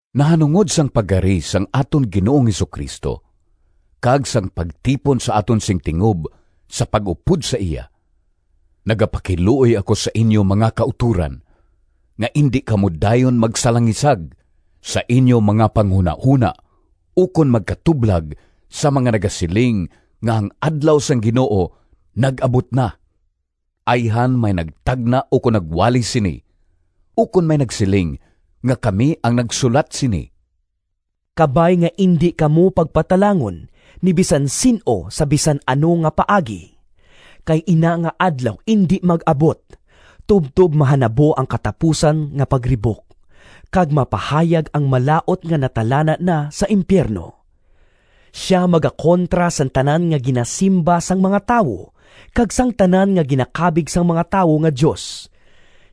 Nahanungod sang pagkari sang aton Ginoong Jesu-Cristo kag sang pagtipon sa aton sing tingob sa pag-upod sa iya: nagapakiluoy ako sa inyo, mga kautoran, nga indi kamo dayon magsalangisag sa inyo mga panghunahona ukon magkatublag sa mga nagasiling nga ang Adlaw sang Ginoo nag-abot na. Ayhan may nagtagna ukon nagwali sini, ukon may nagsiling nga kami ang nagsulat sini. Kabay nga indi kamo pagpatalangon ni bisan sin-o sa bisan ano nga paagi. Kay ina nga Adlaw indi mag-abot tubtob mahanabo ang katapusan nga Pagribok, kag mapahayag ang Malaut nga natalana na sa impiyerno. Sia magakontra sang tanan nga ginasimba sang mga tawo, kag sang tanan nga ginakabig sang mga tawo nga dios.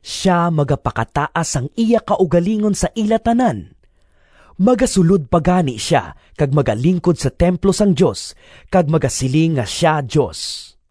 Sia magapakataas sang iya kaugalingon sa ila tanan, magasulod pa gani sia kag magalingkod sa templo sang Dios kag magasiling nga sia Dios!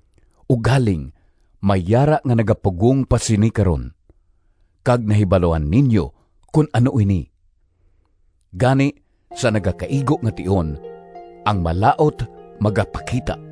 Ugaling may yara nga nagapugong pa sini karon, kag nahibaluan ninyo kon ano ini. Gani, sa nagakaigo nga tion, ang Malaut magapakita.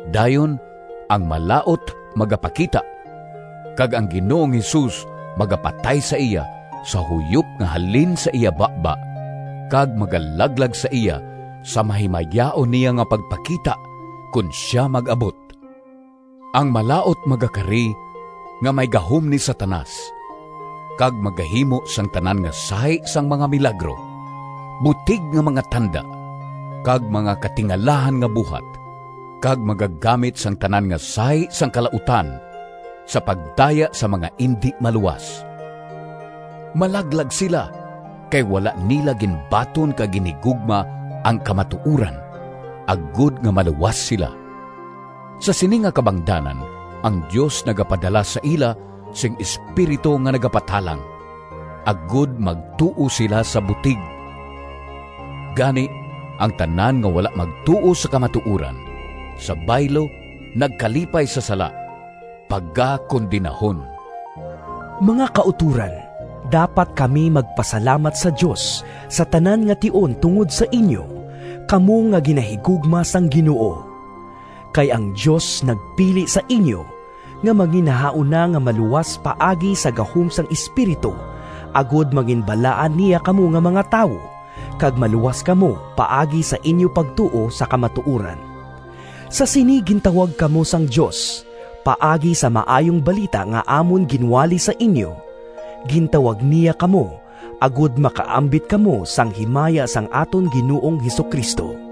Dayon ang Malaut magapakita, kag ang Ginoong Jesus magapatay sa iya sa huyop nga halin sa iya baba kag magalaglag sa iya sa mahimayaon niya nga pagpakita kon sia mag-abot. Ang Malaut magakari nga may gahom ni Satanas kag magahimo sang tanan nga sahi sang mga milagro, butig nga mga tanda kag mga katingalahan nga buhat, kag magagamit sang tanan nga sahi sang kalautan sa pagdaya sa mga indi maluwas. Malaglag sila, kay wala nila ginbaton kag ginhigugma ang kamatuoran agod nga maluwas sila. Sa sini nga kabangdanan ang Dios nagapadala sa ila sing espiritu nga nagapatalang, agod magtuo sila sa butig. Gani ang tanan nga wala magtuo sa kamatuoran, sa baylo nagkalipay sa sala, pagakondenahon. Mga kautoran, dapat kami magpasalamat sa Dios sa tanan nga tion tungod sa inyo, kamo nga ginahigugma sang Ginoo. Kay ang Dios nagpili sa inyo nga manginnahauna nga maluwas paagi sa gahom sang Espiritu agod manginbalaan niya kamo nga mga tawo, kag maluwas kamo paagi sa inyo pagtuo sa kamatuoran. Sa sini gintawag kamo sang Dios paagi sa Maayong Balita nga amon ginwali sa inyo. Gintawag niya kamo agod makaambit kamo sang himaya sang aton Ginoong Jesu-Cristo.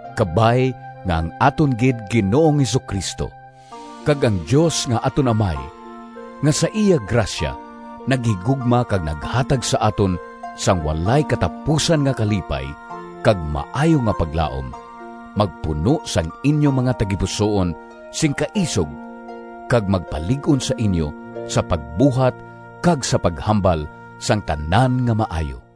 Kabay nga ang aton gid Ginoong Jesu-Cristo, kag ang Dios nga aton Amay, nga sa iya grasya naghigugma kag naghatag sa aton sang walay katapusan nga kalipay kag maayo nga paglaom, magpuno sang inyo mga tagipusoon sing kaisog kag magpalig-on sa inyo sa pagbuhat kag sa paghambal sang tanan nga maayo.